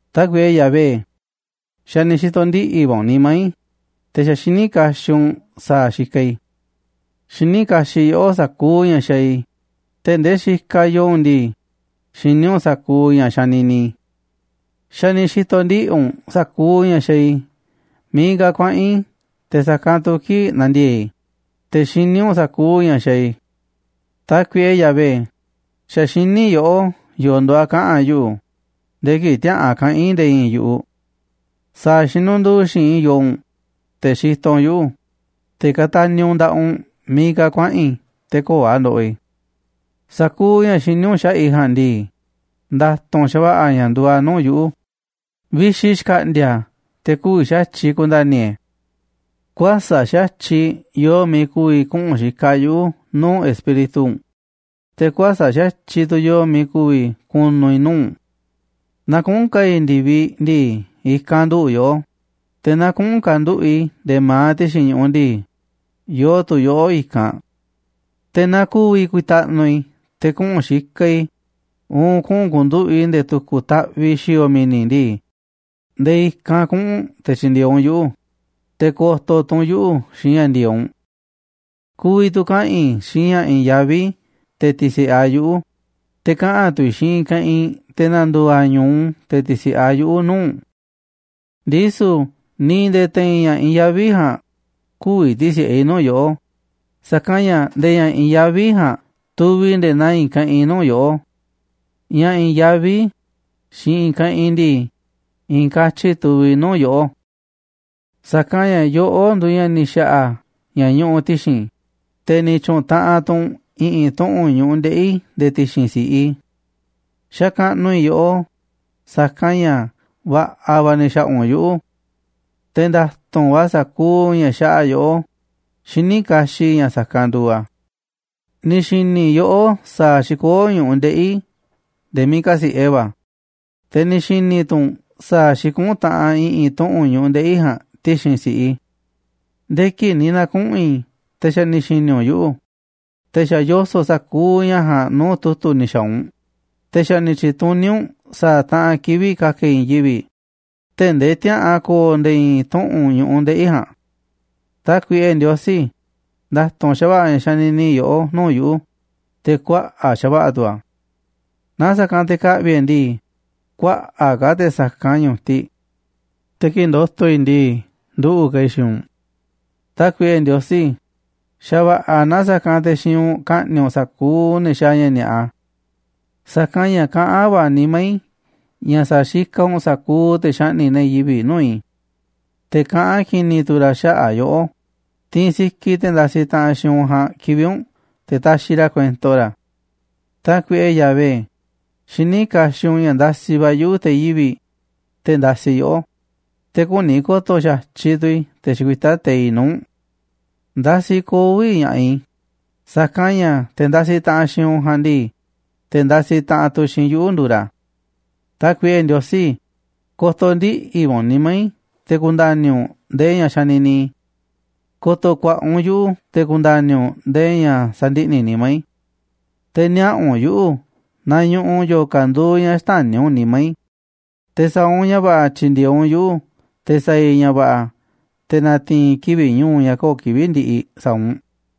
Tákuiꞌe Yahvé, xa̱ ni̱ xi̱to̱ ndiꞌi̱ va̱ u̱nꞌ nimá i̱, te̱ xa̱ xiní kaxiꞌ u̱nꞌ sa̱a̱ xikaꞌ i̱. Xiní kaxiꞌ yoꞌó sa̱kuuꞌ ña̱ xaaꞌ i̱, tee̱ꞌ ndee xikaꞌ yoo u̱nꞌ ndii, xiní u̱nꞌ sa̱kuuꞌ ña̱ xanini i̱. Xa̱ ni̱ xi̱to̱ ndiꞌi̱ u̱nꞌ sa̱kuuꞌ ña̱ xaaꞌ i̱ miiꞌ ka̱ kuaꞌa̱n i̱, te̱ sa̱kanꞌ tu̱ kii̱ꞌ nandiee̱ꞌ i̱, te̱ xiní u̱nꞌ sa̱kuuꞌ ña̱ xaaꞌ i̱. Tákuiꞌe Yahvé, xa̱ xiní yoꞌó yo̱o̱ nduuꞌ a̱ kaꞌa̱n yuꞌu̱ nde̱e̱ kii̱ꞌ tiäa̱ꞌan kaꞌa̱n i̱ nde̱e̱ i̱i̱n yu̱ꞌuꞌ. Sa̱a̱ xinundu̱u̱ xi̱i̱nꞌ i̱ yoo u̱nꞌ, te̱ xitoꞌ u̱nꞌ yuꞌu̱, te̱ kataniꞌ u̱nꞌ nda̱ꞌaꞌ u̱nꞌ miiꞌ ka̱ kuaꞌa̱n i̱ te̱ köo̱ꞌ a̱ ndoꞌoꞌ i̱. Sa̱kuuꞌ ña̱ xiní u̱nꞌ xaꞌa̱ꞌ i̱ ja̱a̱nꞌ ndii, nda̱tu̱nꞌ xa̱va̱ꞌa̱ ña̱ nduuꞌ a̱ nuu̱ꞌ yuꞌu̱, vixi xka̱ꞌndi̱a̱ a̱ te̱ kü̱vi̱ xa̱tyiꞌ ku̱nda̱ni̱ i̱ e̱. Kuäsa̱ꞌ xa̱tyiꞌ yoo miiꞌ ku̱vi̱ kuꞌu̱n xikaꞌ yuꞌu̱ nuu̱ꞌ Espíritu u̱nꞌ, te̱ kuäsa̱ꞌ xa̱tyiꞌ tu̱ yoo miiꞌ ku̱vi̱ ku̱nu̱ i̱ nuu̱ꞌ u̱nꞌ. Naaꞌ kuꞌu̱n ka̱a̱ i̱ ndi̱viꞌ ndii, i̱kanꞌ nduꞌu̱ꞌ yoꞌó, te̱ naa kuꞌu̱n ka̱nduꞌu̱ꞌ i̱ nde̱e̱ ma̱aꞌ ti̱xi̱n ñu̱ꞌuꞌ ndii, yoo tu̱ yoꞌó i̱kanꞌ. Te̱ naaꞌ ku̱vi̱ ku̱ta̱ꞌnu̱ i̱ te̱ kuꞌu̱n xikaꞌ i̱, uun kuꞌu̱n ku̱nduꞌu̱ꞌ i̱ nde̱e̱ tu̱ku̱ taꞌviꞌ xi̱o̱o̱ mi̱ni̱ ndii, nde̱e̱ i̱kanꞌ kuꞌu̱n u̱nꞌ te̱ tyi̱ndi̱e̱eꞌ u̱nꞌ yuꞌu̱, te̱ ko̱to̱ tu̱ u̱nꞌ yuꞌu̱ xiinꞌ ña̱ ndi̱e̱eꞌ u̱nꞌ. Ku̱vi̱ tu̱ kaꞌa̱n i̱ xiinꞌ ña̱ i̱i̱n yaví te̱ ti̱si̱ꞌe a̱ yuꞌu̱, te̱ kaꞌa̱n tu̱ i̱ xiinꞌ i̱i̱n keꞌinꞌ te̱ na̱ndu̱u̱ a̱ ñu̱u te̱ ti̱si̱ꞌe a̱ yuꞌu̱ nuu̱ꞌ u̱nꞌ. Ndisu̱ ni̱ nde̱e̱ te̱i̱n ña̱ i̱i̱n yaví ja̱a̱nꞌ kü̱vi̱ ti̱si̱ꞌe i̱ nuu̱ꞌ yoꞌó, sa̱kanꞌ ña̱ nde̱e̱ ña̱ i̱i̱n yaví ja̱a̱nꞌ tuviꞌ nde̱e̱ naa i̱i̱n keꞌinꞌ nuu̱ꞌ yoꞌó. Ña̱ i̱i̱n yaví xiinꞌ i̱i̱n keꞌinꞌ ndii, i̱i̱n katyi tuviꞌ nuu̱ꞌ yoꞌó. Sa̱kanꞌ ña̱ yoꞌó nduuꞌ ña̱ ni̱ xa̱ꞌa̱ ña̱ ñuꞌuꞌ ti̱xi̱n i̱, te̱ ni̱ tyu̱ꞌu̱n taꞌanꞌ tu̱ u̱nꞌ i̱ꞌi̱n tuꞌu̱nꞌ ñu̱ꞌuꞌ ndeꞌi̱ i̱ nde̱e̱ ti̱xi̱n si̱ꞌiꞌ i̱. Xakaꞌnuꞌ i̱ yoꞌó, sa̱kanꞌ ña̱ va̱ꞌa̱ va̱ ni̱ xa̱ꞌa̱ u̱nꞌ yuꞌu̱. Te̱ nda̱tu̱nꞌ va̱ sa̱kuuꞌ ña̱ xaꞌa yoꞌó, xiní kaxiꞌ i̱ ña̱ sa̱kanꞌ nduuꞌ a̱. Ni̱ xi̱ni̱ yoꞌó sa̱a̱ xikoó ñu̱ꞌuꞌ ndeꞌi̱ i̱ nde̱e̱ miiꞌ kasi̱ꞌe va̱, te̱ ni̱ xi̱ni̱ tu̱ u̱nꞌ sa̱a̱ xikuꞌún taꞌanꞌ i̱ꞌi̱n tuꞌu̱nꞌ ñu̱ꞌuꞌ ndeꞌi̱ i̱ ja̱a̱nꞌ ti̱xi̱n si̱ꞌiꞌ i̱. Nde̱e̱ kii̱ꞌ ni̱ na̱kuꞌu̱n i̱, te̱ xa̱ ni̱ xi̱ni̱ u̱nꞌ yuꞌu̱, te̱ xa̱ yoso̱ꞌ sa̱kuuꞌ ña̱ ja̱a̱nꞌ nuu̱ꞌ tu̱tu̱ ni̱ xa̱a̱ u̱nꞌ, te̱ xa̱ ni̱ tyi̱tuní u̱nꞌ sa̱a̱ taꞌanꞌ kivi̱ꞌ ka̱ka̱ i̱ i̱i̱n yivi̱ꞌ, tee̱ꞌ ndee tiäa̱ꞌan ko̱o̱ nde̱e̱ i̱i̱n tuꞌu̱nꞌ ñu̱ꞌuꞌ ndeꞌi̱ i̱ ja̱a̱nꞌ. Tákuiꞌe Ndiosí, nda̱tu̱nꞌ xa̱va̱ꞌa̱ ña̱ xanini yoꞌó nuu̱ꞌ yuꞌu̱, te̱ kuaꞌa̱ꞌ xa̱va̱ꞌa̱ tu̱ a̱. Naaꞌ sa̱kanꞌ te̱ ka̱ꞌvi̱ e̱ꞌ e̱ ndii, kuaꞌa̱ꞌ ka̱ te̱ sa̱kanꞌ ñu̱tiꞌ. Te̱ kii̱ꞌ ndo̱to̱ i̱ ndii, nduꞌu̱ꞌ ka̱ i̱ xiinꞌ u̱nꞌ. Tákuiꞌe Ndiosí, xa̱va̱ꞌa̱ na sa̱kanꞌ te̱ xiinꞌ u̱nꞌ ka̱ꞌni̱ꞌ u̱nꞌ sa̱kuuꞌ ne̱ xaaꞌ ña̱ ni̱a̱ꞌa. Sa̱kanꞌ ña̱ kaꞌán va̱ nimá i̱ ña̱ sa̱xikaꞌ u̱nꞌ sa̱kuuꞌ te̱ xaꞌni̱ꞌ ne̱ yivi̱ꞌ nuu̱ꞌ i̱. Te̱ kaꞌán ki̱ni̱ tu̱ ra̱ xaꞌa̱ꞌ yoꞌó, tiinꞌ sikiꞌ te̱ ndasiꞌ taꞌanꞌ xiinꞌ u̱nꞌ ja̱a̱nꞌ kivi̱ꞌ u̱nꞌ te̱ taxiꞌ ra̱ kuento ra̱. Tákuiꞌe Yahvé, xiní kaxiꞌ u̱nꞌ ña̱ ndasiꞌ va̱ yuꞌu̱ te̱ yivi̱ꞌ, te̱ ndasiꞌ yoꞌó, te̱ küni ko̱to̱ xa̱tyiꞌ tu̱ i̱ te̱ xikuitá teiꞌ nuu̱ꞌ u̱nꞌ. Ndasiꞌ koo̱ꞌ vi̱ꞌ ña̱ꞌaꞌ i̱, sa̱kanꞌ ña̱ te̱ ndasiꞌ taꞌanꞌ xiinꞌ u̱nꞌ ja̱a̱nꞌ ndii, te̱ ndasiꞌ taꞌanꞌ tu̱ xiinꞌ yuꞌu̱ nduuꞌ ra̱. Tákuiꞌe Ndiosí, ko̱to̱ ndiꞌi̱ va̱ u̱nꞌ nimá i̱ te̱ ku̱nda̱ni̱ u̱nꞌ ndee ña̱ xanini i̱, ko̱to̱ ku̱a̱ꞌa̱ u̱nꞌ yuꞌu̱ te̱ ku̱nda̱ni̱ u̱nꞌ ndee ña̱ sandiꞌni̱ nimá i̱. Te̱ niaꞌa̱ u̱nꞌ yuꞌu̱ naaꞌ ñuꞌuꞌ yo̱o̱ ka̱ nduuꞌ ña̱ xtäni̱ u̱nꞌ nimá i̱, te̱ sa̱a̱ u̱nꞌ ña̱ va̱ꞌa̱ tyi̱ndi̱e̱eꞌ u̱nꞌ yuꞌu̱, te̱ sa̱a̱ i̱ ña̱ va̱ꞌa̱ te̱ na̱ti̱i̱n i̱ kivi̱ꞌ ñu̱u̱ ña̱ köo̱ꞌ kivi̱ꞌ ndiꞌiꞌ sa̱a̱ u̱nꞌ.